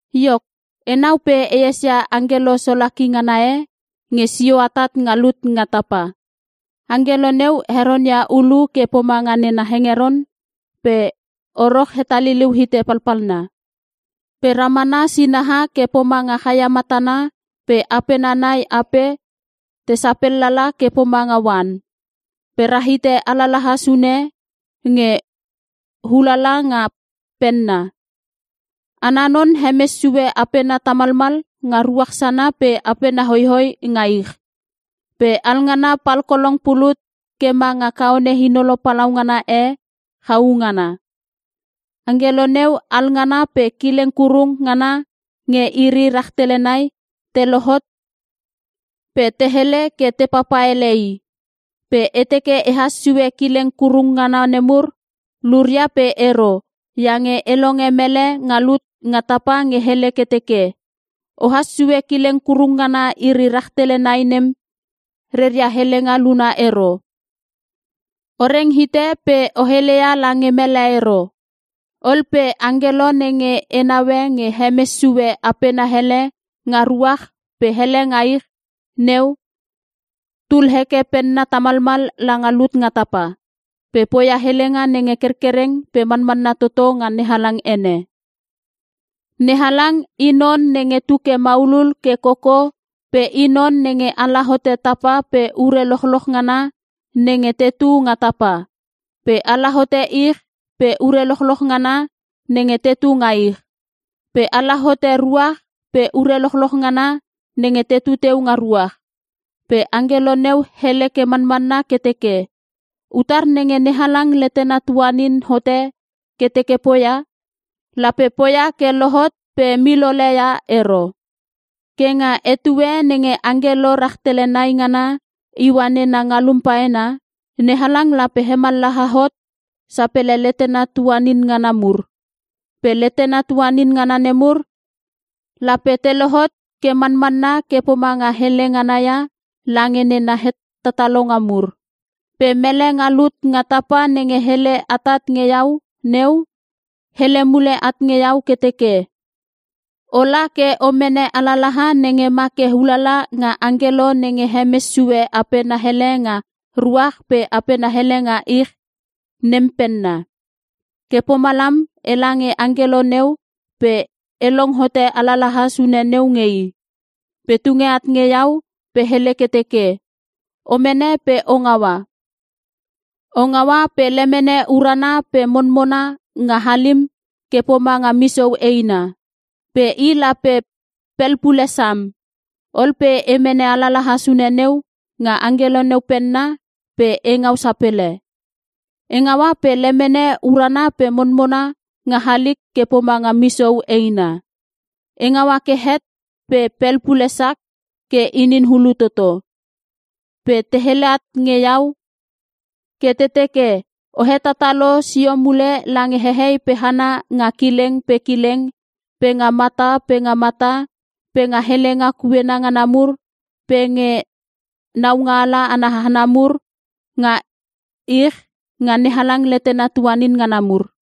Iok, enau pe e esia angkelo solaki ngana e nge sio atat nga lut nga tapa. Angkelo neu heronia ulu ke pomanga nena hengeron pe oro hetaliliu hite palpalna. Pe ramana sinaha ke pomanga chaia matana pe apena nai ape te sapellala ke pomanga oan. Pe rahite alalaha sune nge ulala nga penna. Ana non hemes sue apena tamalmal nga ruach sana pe apena hoihoi nga ich. Pe alngana palkolong pulut ke manga kaone inolo palaungana e chau ngana. Angkelo neu alngana pe kileng kurung ngana nge iri rahtele nai te lohot pe te hele ke te papa ele i. Pe e teke ehas sue kileng kurung ngana nemur luria pe ero, iange e longe mele nga lut nga tapa nge hele ke teke, “Ohas sue kileng kurung ngana iri rahtele nai nem, reria helenga luna ero. O reng hite pe o heleia lange mele ero.” Ol pe angkelo nenge e naue nge hemes sue apena hele nga ruach pe hele nga ich neu, tul heke penna tamalmal langa lut nga tapa. Pe poia helenga nenge kerkereng pe manmanna toto nga NeHalang ene. NeHalang i non nenge tuke maulul ke koko pe I non nenge ala hote tapa pe ure lochloch ngana nenge tetu nga tapa. Pe ala hote ich pe ure lochloch ngana nenge tetu nga ich. Pe ala hote ruach pe ure lochloch ngana nenge tetu teu nga ruach. Pe angkelo neu hele ke manmanna ke teke, “Utar nenge NeHalang letena tuanin hote ke teke poia, lape poia ke lohot pe milole ia ero. Ke nga etue nenge angkelo rahtele nai ngana iua nena ngalum paena, NeHalang lape hemallaha hot sapele letena tuanin ngana mur. Pe letena tuanin ngana nemur lape te lohot ke manmanna ke pomanga hele nganaia lange nena hetatalonga mur.” Pe mele nga lut nga tapa nenge hele atat nge iau neu, hele mule at nge iau ke teke, “Ola ke o mene alalaha nenge ma ke ulala nga angkelo nenge hemes sue apena hele nga ruach pe apena hele nga ich nem penna.” Ke pomalam, ela nge angkelo neu pe e long hote alalaha sune neu nge i. Pe tunge at nge iau pe hele ke teke, “O mene pe o ngaua. O ngaua pe lemene urana pe monmona nga halim ke pomanga misou eina. Pe i lape pelpule sam.” Ol pe e mene alalaha sune neu nga angkelo neu penna pe e ngau sapele. E ngaua pe lemene urana pe monmona nga halik ke pomanga misou eina. E ngaua ke het pe pelpule sak ke inin hulu toto. Pe te hele at nge iau ke te teke, “O hetatalo sio mule lange hehei pe hana nga kileng pe kileng, pe nga mata pe mata, pe nga helenga kuena ngana mur, pe nge naungaala ana hana mur nga ich nga NeHalang letena tuanin ngana mur.”